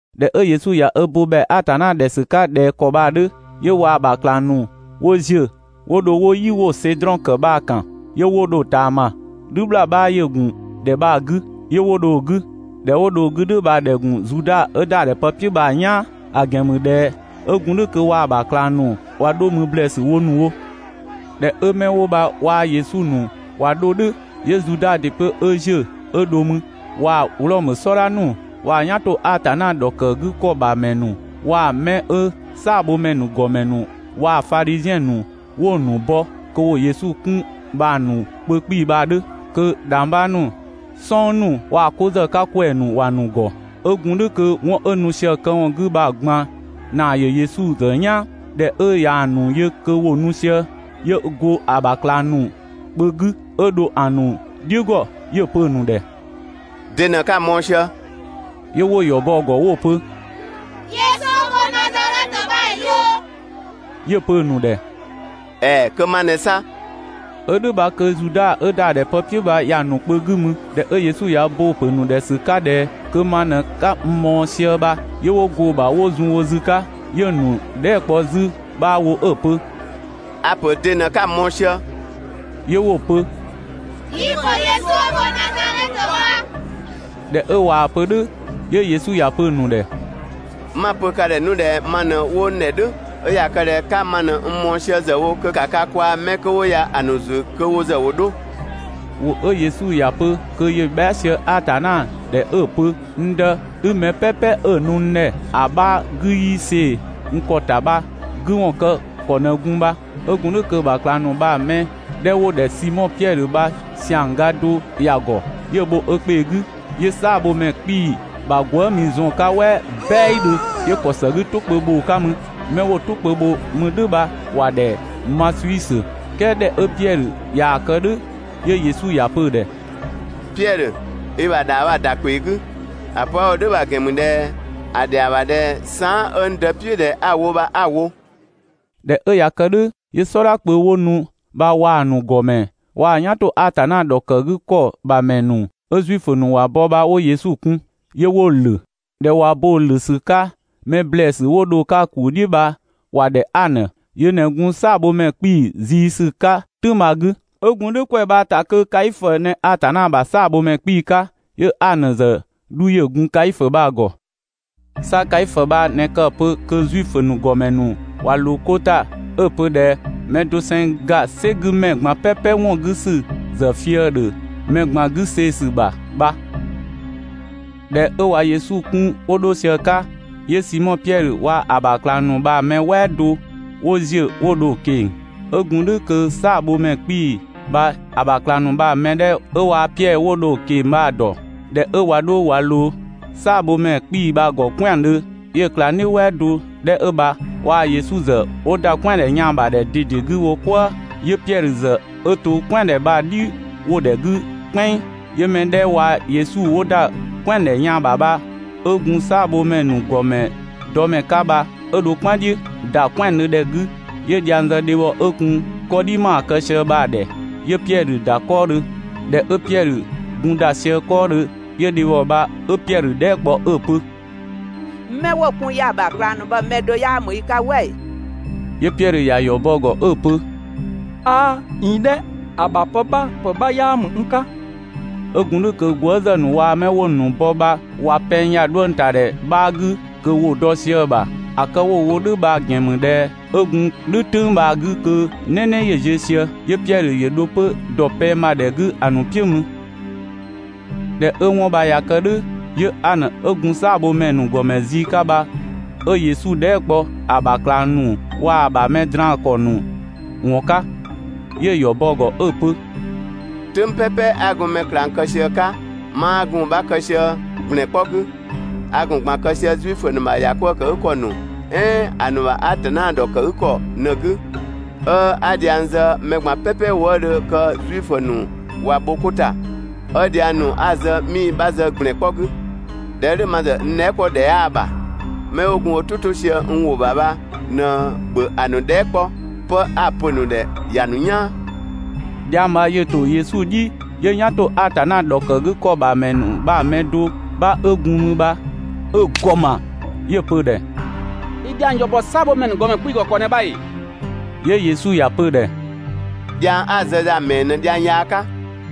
꞊Dhɛ 'ö Yesu ꞊ya ö bo ‑bhɛa Atanna ‑dhɛ ‑sü 'ka ꞊dhɛ ‑kɔ bha‑ 'dhö, 'yö waa‑ ‑bha ꞊klang ‑nu 'wo ‑ziö 'wo dho 'wo "yi 'wo‑ Sedrɔn ‑kë bha‑ ‑kan, 'yö 'wo dho‑ ꞊taama. "Dhü ‑bhlaa 'bha ‑yö ‑gun ‑dhɛ bha‑ 'gü, 'yö 'wo dho‑ 'gü. ‑Dhɛ 'wo dho‑ 'gü "dhʋ̈ bha‑ ‑dhɛ ‑gun Zuda 'ö ‑da ‑dhɛ pë "piʋ̈ bha‑ "yaan, ‑a ‑gɛn ‑mü ꞊dhɛ 'ö gun "dhʋ̈ kö waa‑ ‑bha ꞊klang ‑nu ꞊wa 'dho mü ‑blɛɛsü wo ‑nu wo. ꞊Dhɛ 'ö 'mɛ 'wo bha waa‑ Yesu ‑nu ꞊wa 'dho "dhʋ̈, 'yö Zuda ‑dɩ 'pö 'ö ‑ziö 'ö dho mü, waa‑ Wlɔmö "sɔdha ‑nu, waa‑ "yan ‑to Atanna ‑dhɔkëgükɔ ‑bha ‑mɛ ‑nu, waa‑ 'mɛ 'ö "saabhomɛ ‑nu ‑gɔmɛ ‑nu waa‑ Fadhiziɛn ‑nu 'wo‑ ‑nu bɔ kö ‑wo Yesu 'kun bha‑ ‑nu kpö 'kpii‑ bha‑ 'dhö. Kö ‑dhangbha ‑nu, "sɔng ‑nu waa‑ 'ko ‑zë 'ka ‑kwɛɛ ‑nu ‑wa ‑nu ‑gɔ. 'Ö gun "dhʋ̈ kö 'wɔn 'ö nu sië‑ këwɔn 'gü bha‑ ꞊gban ‑naa ‑yö Yesu ‑zë "yaan. ꞊Dhɛ 'ö ꞊yaa‑ ‑nu yö kö ‑wo nu sië, 'yö go ö ‑bha ꞊klang ‑nu kpö 'gü 'ö dho‑ ‑nu "dhiʋ̈ ‑gɔ, 'yö‑ pö‑ ‑nu ‑dhɛ: «'De ꞊në 'ka‑ mɔɔ‑ sië?» 'Yö 'wo‑ ‑yɔ bɔ‑ ‑gɔ 'wo‑ pö: «Yesu 'ö go Nazadhɛtö bha‑ yö.» 'Yö‑ pö‑ ‑nu ‑dhɛ: «‑Ɛɛ! Kö ma ꞊nɛ 'sa.» 'Ö "dhʋ̈ bha kö Zuda 'ö ‑da ‑dhɛ pë "piʋ̈ bha ‑ya ‑nu kpö 'gü mü. ꞊Dhɛ Yesu ꞊ya ö bo‑ ‑pö ‑nu ‑dhɛ ‑sü 'ka ꞊dhɛ «kö ma ꞊në 'ka n mɔɔ‑ sië bha», 'yö 'wo go‑ ‑bha wo zun wo zü 'ka. 'Yö‑ ‑nu dhɛɛ" kpɔ 'zü 'bha wo 'ö‑ pö: «A‑ pö de ꞊në 'ka‑ mɔɔ‑ sië?» 'Yö 'wo‑ pö: «Yi‑ ‑pö Yesu 'ö go Nazadhɛtö bha.» ꞊Dhɛ 'ö ꞊waa‑ pö "dhʋ̈ 'yö Yesu ‑ya pö‑ ‑nu ‑dhɛ: «'Ma‑ pö ka ‑dhɛ 'nu ꞊dhɛ ma ꞊në 'wo n ‑dhɛ "dhʋ̈, 'ö ꞊ya kë ꞊dhɛ 'ka ma ꞊në n mɔɔ‑ sië ‑zë wo kö ‑ka ka kwaa‑ 'mɛ 'kö 'wo ya‑ ‑nu ‑zü kö wo ‑zë ‑wo 'dho.» ‑Wʋ 'ö Yesu ‑ya pö kö ‑yö bhɛa" sië Atanna ‑dhɛ 'ö‑ pö: «N Dë, 'i mɛ "pɛpɛ 'ö‑ nu n ‑dhɛ ‑a 'bha 'gü 'yii see‑ n ‑kɔ ‑ta bha‑ 'gü ‑wɔn kë ‑kɔ ꞊në gun bha.» 'Ö gun "dhʋ̈ kö‑ ‑bha ꞊klang ‑nu bha‑ mɛ 'dhɛ 'wo‑ ‑dhɛ Simɔ Piɛdhö bha ‑siang ga do ‑ya ‑gɔ. 'Yö‑ bho ö ‑kpee 'gü, 'yö "saabhomɛ ‑nu ‑gɔmɛ 'kpii‑ ‑bha gwëëmi zɔn‑ 'ka "wɛ "bɛidhö, 'yö‑ ‑kɔ ‑së 'gü "tʋ kpö bho‑ 'ka mü. 'Mɛ 'wo‑ "tʋ kpö bho 'mü "dhʋ̈ bha ‑wa ‑dhɛ Masiusö. "Kɛɛ ꞊dhɛ 'ö Piɛdhö ꞊yaa‑ kë "dhʋ̈ 'yö Yesu ‑ya pö‑ ‑dhɛ: «Piɛdhö, i ‑bha ‑dhaa bha‑ ‑da ‑kpee 'gü! ‑A pö 'a‑ wo "dhʋ̈ bha‑ ‑gɛn ‑mü ꞊dhɛ ‑a ‑dhɛa ‑bha ꞊dhɛ saan" 'ö n Dë "piʋ̈ ꞊dhɛ 'a‑ wo bha 'a‑ wo. ꞊Dhɛ 'ö ꞊ya kë "dhʋ̈ 'yö "sɔdha kpö 'wo nu bha waa‑ ‑nu ‑gɔmɛ waa‑ "yan ‑to Atanna ‑dhɔkëgükɔ ‑bha ‑mɛ ‑nu 'ö Zuifö ‑nu ‑wa bɔ bha 'wo Yesu kun, 'yö 'wo‑ ‑lö. ꞊Dhɛ ꞊wa bo‑ ‑lö ‑sü 'ka, mɛ ‑blɛɛsü 'wo dho‑ 'ka‑ ‑kuu "dhiʋ̈ bha ‑wa ‑dhɛ Anö (yö ꞊në gun "saabhomɛ 'kpii‑ ziisü 'ka "tʋ̈ng bha‑ 'gü). 'Ö gun "dhʋ̈ ‑kwɛ bha‑ ‑ta kö Kaifö ꞊në Atanna ‑bha "saabhomɛ 'kpii‑ 'ka, 'yö Anö ‑zë 'dhu ‑yö gun Kaifö bha‑ ‑gɔ. 'Sa Kaifö bha ꞊në kë‑ pö kö Zuifö ‑nu ‑gɔmɛ ‑nu ꞊wa ꞊loo 'ko ‑ta 'ö‑ pö ꞊dhɛ: «Mɛ doseng ‑ga "sɛ 'gü ‑mɛ ꞊gban "pɛpɛ ‑wɔn 'gü ‑sü ‑zë fië‑ ‑dhö mɛ ꞊gban 'gü see‑ ‑sü ‑bha» bha. ꞊Dhɛ 'ö ꞊wa Yesu 'kun 'wo dho sië‑ 'ka, 'yö Simɔ Piɛdhö waa‑ ‑bha ꞊klang ‑nu bha‑ mɛ "wɛɛ do ‑wo ‑ziö 'wo dho‑ ꞊keng‑. 'Ö gun "dhʋ̈ kö "saabhomɛ 'kpii‑ bha ‑ya ‑bha ꞊klang ‑nu bha‑ mɛ 'dhɛ 'ö waa‑ Piɛdhö 'wo dho‑ ꞊keng‑ bha‑ ‑dɔ. ꞊Dhɛ 'ö ꞊wa 'dho ꞊wa ꞊loo "saabhomɛ 'kpii‑ bha‑ ‑gɔ "kwɛandhö, 'yö ꞊klangdhiʋ̈ "wɛɛ do 'dhɛ 'ö bha waa‑ Yesu ‑zë 'wo ‑da "kwɛandhɛ yaan‑ bha ‑dhɛ ꞊dede 'gü wo "kwëë. 'Yö Piɛdhö ‑zë 'ö to "kwɛandhɛ bha‑ "dhi ‑wo ‑dhɛ 'gü "kpɛnng. 'Yö‑ mɛ 'dhɛ waa‑ Yesu 'wo ‑da "kwɛandhɛ yaan‑ ‑bha, 'ö gun "saabhomɛ ‑nu ‑gɔmɛ dɔ ‑mɛ 'ka bha 'ö dho "kpan "dhiʋ̈, ‑da "kwɛandhö ‑dhɛ 'gü, 'yö dhiang zë dhebhɔ 'ö gun 'kɔdhi ‑maa kë sië bha‑ ‑dhɛ, 'yö Piɛdhö ‑da 'kɔɔdhö. ꞊Dhɛ 'ö Piɛdhö gun ‑da sië 'kɔɔdhö, 'yö dhebhɔ bha 'ö Piɛdhö dhɛɛ" kpɔ 'ö‑ pö: «'Mɛ 'wo‑ kun ya‑ ‑bha ꞊klang ‑nu bha‑ mɛ do 'yaa ‑mü i 'ka "wɛ ‑ee?» 'Yö Piɛdhö ‑ya ‑yɔ bɔ‑ ‑gɔ 'ö‑ pö: «'Aa! ꞊Iin "dhɛ! ‑A ‑bha pë 'bha ‑pë 'bha 'yaa ‑mü n 'ka!» 'Ö gun "dhʋ̈ kö gwëëzë ‑nu waa‑ 'mɛ 'wo‑ ‑nu bɔ bha ꞊wa pɛng ‑ya 'dhuëngtadhɛ bha‑ 'gü kö ‑wo dɔ sië‑ ‑bha. ‑A kë 'wo‑ wo "dhʋ̈ bha‑ ‑gɛn ‑mü ꞊dhɛ 'ö gun "dhʋ̈ "tʋ̈ng bha‑ 'gü kö "nɛnɛ ‑yö ziö sië. 'Yö Piɛdhö ‑yö dho 'pö ‑dɔ pɛng ‑bha ‑dhɛ 'gü ‑a ‑nu "piʋ̈ mü. ꞊Dhɛ 'ö 'wɔn bha ꞊ya kë "dhʋ̈, 'yö Anö 'ö gun "saabhomɛ ‑nu ‑gɔmɛ zii 'ka bha 'ö Yesu dhɛɛ" kpɔ ‑a ‑bha ꞊klang ‑nu 'waa‑ ‑bha mɛ draan‑ ‑kɔ ‑nu ‑wɔn 'ka. 'Yö‑ ‑yɔ bɔ‑ ‑gɔ 'ö‑ pö: «"Tʋ̈ng "pɛpɛ 'a gun mɛ ꞊klang kë sië‑ 'ka 'maa gun‑ 'bha kë sië ‑gblɛn 'kpɔ 'gü, a ‑gun ꞊gban kë sië Zuifö ‑nu ‑bha ‑yakwëëkëgükɔ ‑nu "ɛɛn ‑a ‑nu ‑bha Atanna ‑dhɔkëgükɔ ꞊në‑ 'gü, 'ö 'a dhiang zë mɛ ꞊gban "pɛpɛ wëëdhö kö Zuifö ‑nu ꞊wa bho 'ko ‑ta, 'ö dhiang ‑nu 'a‑ zë 'mii‑ 'bha zë ‑gblɛn 'kpɔ 'gü. ꞊Dhɛ 'ö "dhʋ̈, ma ‑zë n dhɛɛ" 'kpɔ ‑dhɛ 'yaa‑ ‑bha. 'Mɛ 'wo gun wo "tʋ 'to sië n ‑wʋ ‑bha bha ꞊në ‑bhö ‑a ‑nu dhɛɛ" 'kpɔ, 'pë 'a‑ pö‑ ‑nu ‑dhɛ ‑ya ‑nu "yaan.» Dhiang bha ‑yö ‑to Yesu "dhi 'yö "yan ‑to Atanna ‑dhɔkëgükɔ ‑bha ‑mɛ ‑nu bha‑ mɛ do 'bha 'ö gun mü bha 'ö‑ ‑gɔ ‑ma, 'yö‑ pö‑ ‑dhɛ: «I dhiang ‑yɔ ‑bɔ "saabhomɛ ‑nu ‑gɔmɛ 'kpii‑ ‑gɔ ‑kɔ ꞊në bha ‑ee?» 'Yö Yesu ‑ya pö‑ ‑dhɛ: «Dhiang 'a‑ zë ya‑ ‑mɛɛ ꞊në dhiang yaa 'ka?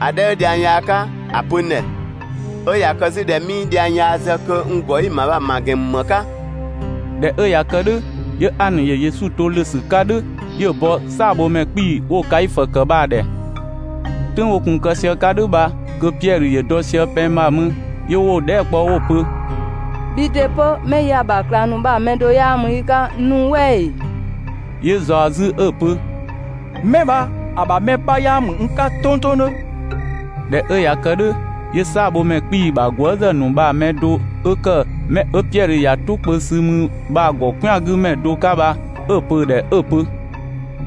‑A 'dhɛ 'ö dhiang yaa 'ka ‑a pö n ‑dhɛ. 'Ö ꞊ya kë 'zü ꞊dhɛ 'mii dhiang yaa zë kö n ‑gɔ 'i‑ ‑ma ya‑ ‑ma ‑gɛn ‑mü ‑më 'ka?» ꞊Dhɛ 'ö ꞊ya kë "dhʋ̈, 'yö Anö ‑yö Yesu to ‑lö ‑sü 'ka "dhʋ̈ 'yö‑ bɔ "saabhomɛ 'kpii‑ 'wo‑ Kaifö ‑kë bha‑ ‑dhɛ. "Tʋ̈ng 'wo gun‑ kë sië‑ 'ka "dhʋ̈ bha kö Piɛdhö ‑yö dɔ sië pɛng ‑bha mü. 'Yö 'wo‑ dhɛɛ" kpɔ 'wo‑ pö: «Bhii ‑dɩ 'pö 'mɛ 'ö ya‑ ‑bha ꞊klang ‑nu bha‑ mɛ do 'yaa ‑mü i 'ka nu "wɛ ‑ee?» 'Yö‑ ꞊zaɔ 'zü 'ö‑ pö: «'Mɛ bha‑ ‑bha mɛ 'bha 'yaa ‑mü n 'ka tongtongdhö!» ꞊Dhɛ 'ö ꞊ya kë "dhʋ̈, 'yö "saabhomɛ ‑nu ‑gɔmɛ ‑bha gwëëzë ‑nu bha‑ mɛ do 'ö ‑kë 'mɛ 'ö Piɛdhö ‑ya "tʋ kpö sü mü bha‑ ‑gɔ "kwɛangümɛ do 'ka bha 'ö‑ pö‑ ‑dhɛ 'ö‑ pö: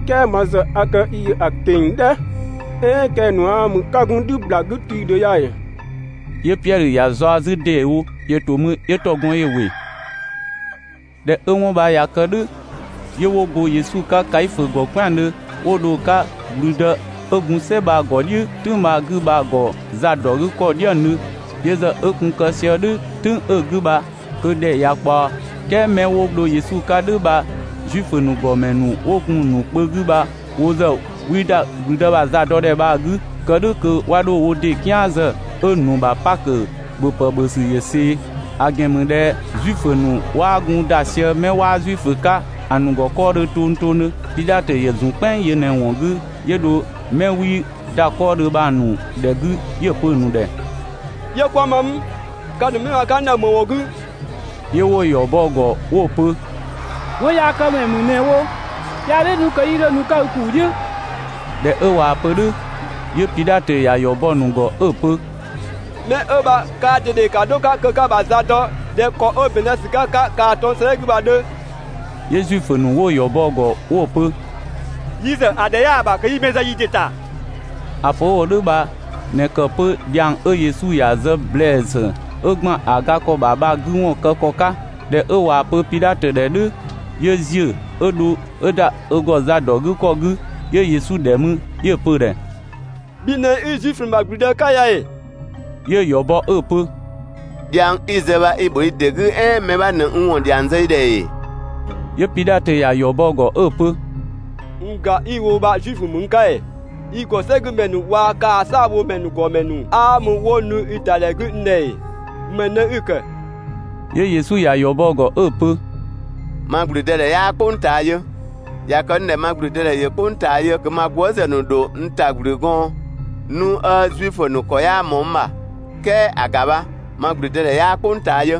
«"Kɛɛ ma ‑zë a kë i ‑yö ‑a ꞊keng‑ "dhɛ. "Ɛɛn kɛng‑ ‑nu 'aa mü 'ka gun "dhü ‑bhlaa 'gü tii‑ ‑dhö ya ‑ee?» 'Yö Piɛdhö ‑ya zaɔ‑ 'zü ‑deewo. ‑Yö ‑to mü 'yö ‑tɔgɔn ‑yö ‑wɩ. ꞊Dhɛ 'ö 'wɔn bha ꞊ya kë "dhʋ̈, 'yö 'wo go Yesu 'ka Kaifö ‑gɔ "kwɛandhö 'wo dho‑ 'ka ‑gblüdë 'ö gun "sɛ bha‑ ‑gɔ "dhiʋ̈ "tʋ̈ng bha‑ 'gü bha‑ ‑gɔ zadɔgükɔ "dhiëngdhö. Yö ‑zë 'ö gun kë sië "dhʋ̈ "tʋ̈ng 'ö‑ 'gü bha kö ‑dhɛ ꞊ya ꞊kpaɔ, "kɛɛ 'mɛ 'wo dho Yesu 'ka "dhʋ̈ bha Zuifö ‑nu ‑gɔmɛ ‑nu 'wo gun‑ ‑nu kpö 'gü bha wo ‑zë 'wii ‑da ‑gblüdë ‑bha zadɔdhɛ bha‑ 'gü, kë "dhʋ̈ kö 'wa 'dho wo ‑dɩ "kian zë 'ö‑ ‑nu ‑bha Pakö ‑bhöpë ‑bhö ‑sü ‑yö ꞊see. (‑A ‑gɛn ‑mü ꞊dhɛ Zuifö ‑nu 'waa gun ‑da sië 'mɛ 'waa Zuifö 'ka‑ ‑nu ‑gɔ 'kɔɔdhö tongtongdhö.) Pidhatö ‑yö zun "kpɛnng yö ꞊në‑ ‑wɔn 'gü 'yö dho 'mɛ 'wii ‑da 'kɔɔdhö bha‑ ‑nu ‑dhɛ 'gü 'yö‑ pö‑ ‑nu ‑dhɛ: «'Yö 'kwa‑ ma mü? Ka ‑nu 'mɛ bha‑ 'ka n ‑dhɛ ‑më ‑wɔn 'gü?» 'Yö 'wo‑ ‑yɔ bɔ‑ ‑gɔ 'wo‑ pö: «'Wɔnyaakëmɛ ‑mü ꞊në‑ wo, 'yaa "dhʋ̈ 'nu kö 'yii 'dho nu‑ 'ka i ‑kuu "dhiʋ̈.» ꞊Dhɛ 'ö ꞊waa‑ pö "dhʋ̈, 'yö Pidhatö ‑ya ‑yɔ bɔ‑ ‑nu ‑gɔ 'ö‑ pö: «'Mɛ 'ö bha kaa ꞊dede ‑ka 'dho‑ 'ka kö 'ka‑ ‑bha za dɔ ꞊dhɛ ‑kɔ 'ö ‑bɛn zë ‑sü 'ka‑ 'ka kaa‑ 'tɔng‑ 'gü bha‑ 'dhö!» 'Yö Zuifö ‑nu 'wo‑ ‑yɔ bɔ‑ ‑gɔ 'wo‑ pö: «Yi ‑zë ‑a ‑dhɛ 'yaa‑ ‑bha kö 'yi mɛ zë yi ‑dɩ ‑ta.» ‑A pö 'wo‑ wo "dhʋ̈ bha ꞊në ‑kë 'pö dhiang 'ö Yesu ‑ya zë ‑blɛɛsü 'ö ‑gban ‑a ga ‑kɔ ‑bha bha‑ 'gü ‑wɔn kë ‑kɔ 'ka. ꞊Dhɛ 'ö ꞊waa‑ pö Pidhatö ‑dhɛ "dhʋ̈, 'yö ‑ziö 'ö dho 'ö ‑da 'zü ‑deewo ö ‑gɔ zadɔgükɔ 'gü, 'yö Yesu ‑dhɛ mü, 'yö‑ pö‑ ‑dhɛ: «Bhi ꞊në 'i Zuifö ‑nu ‑bha ‑gblüdë 'ka ya ‑ee?» 'Yö‑ ‑yɔ bɔ 'ö‑ pö: «Dhiang 'i‑ zë bha i‑ ‑bho i ‑dɩ 'gü, "ɛɛn mɛ 'bha ꞊në n ‑wɔn ‑dhiang zë i ‑dhɛ ‑ee?» 'Yö Pidhatö ‑ya ‑yɔ bɔ‑ ‑gɔ 'ö‑ pö: «N ‑ga 'i‑ wo bha Zuifö ‑mü n 'ka ‑ee? I ‑gɔ "sɛ 'gü ‑mɛ ‑nu waa‑ kaa‑ "saabhomɛ ‑nu ‑gɔmɛ ‑nu ꞊në 'aa mü 'wo nu i ‑da ‑dhɛ 'gü n ‑dhɛ ‑ee? ‑Më ꞊në 'i‑ ‑kë?» 'Yö Yesu ‑ya ‑yɔ bɔ‑ ‑gɔ 'ö‑ pö: «Ma ‑gblüdëdhɛ 'yaa "kpʋng ꞊taa yö. ꞊Ya kë 'nu ꞊dhɛ ma ‑gblüdëdhɛ ‑yö "kpʋng ꞊taa yö kö ma gwëëzë ‑nu ‑dho n ta ‑gblü gɔɔn 'nu 'ö Zuifö ‑nu ‑kɔ 'yaa ꞊mɔɔ n ‑bha, "kɛɛ ‑a ‑ga bha, ma ‑gblüdëdhɛ 'yaa "kpʋng ꞊taa yö.»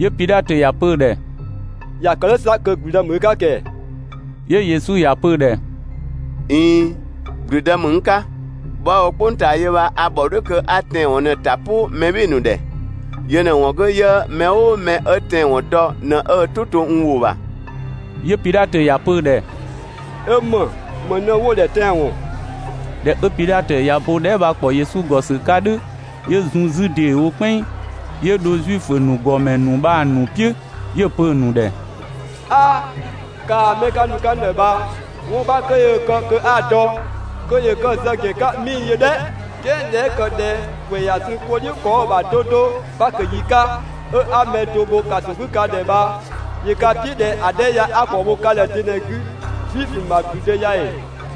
'Yö Pidhatö ‑ya pö‑ ‑dhɛ: «꞊Ya kë "dhʋ̈ 'sa kö ‑gblüdë ‑mü i 'ka ‑kɛɛ?» 'Yö Yesu ‑ya pö‑ ‑dhɛ: «꞊Iin, ‑gblüdë ‑mü n 'ka.» Bhɔ 'a‑ wo "kpʋng ꞊taa yö bha a ‑bhɔ "dhʋ̈ kö 'a tɛanwɔn ꞊në‑ ‑ta "pʋ mɛ "bhɩɩ‑ ‑nu ‑dhɛ. Yö ꞊në‑ ‑wɔn 'gü 'yö mɛ "ʋʋ mɛ 'ö tɛanwɔn dɔ ꞊në ö "tʋ 'to n ‑wʋ ‑bha.» 'Yö Pidhatö ‑ya pö‑ ‑dhɛ: «'Ö ‑më? ‑Më ꞊në 'wo‑ ‑dhɛ tɛanwɔn?» ꞊Dhɛ 'ö Pidhatö ꞊ya bo dhɛɛ" bha‑ ‑kpɔ Yesu ‑gɔ ‑sü 'ka "dhʋ̈, 'yö zun 'zü ‑deewo "kpɛnng 'yö dho Zuifö ‑nu ‑gɔmɛ ‑nu bha‑ ‑nu "piʋ̈, 'yö‑ pö‑ ‑nu ‑dhɛ: «'Aa! Kaa‑ 'mɛ ka nu‑ 'ka n ‑dhɛ bha, 'wɔn 'bha 'kö yöö‑ kë kö 'a‑ dɔ, kö ‑yö kë‑ zë ‑gɛn 'ka 'mii‑ yö "dhɛ! "Kɛɛ ꞊dhɛ 'ö ‑kë ꞊dhɛ ‑kwɛ ꞊ya zun 'ko "dhiʋ̈ ‑kɔ 'ö‑ ‑bha 'do 'do Pakö yi 'ka, 'ö 'a mɛ do bho ‑kaso 'gü ka ‑dhɛ bha, ‑yö ka "piʋ̈ ꞊dhɛ ‑a 'dhɛ ya 'a ‑kɔ bho ka ‑dhɛ de ꞊në‑ 'gü? Zuifö ‑nu ‑bha ‑gblüdë ya ‑ee?»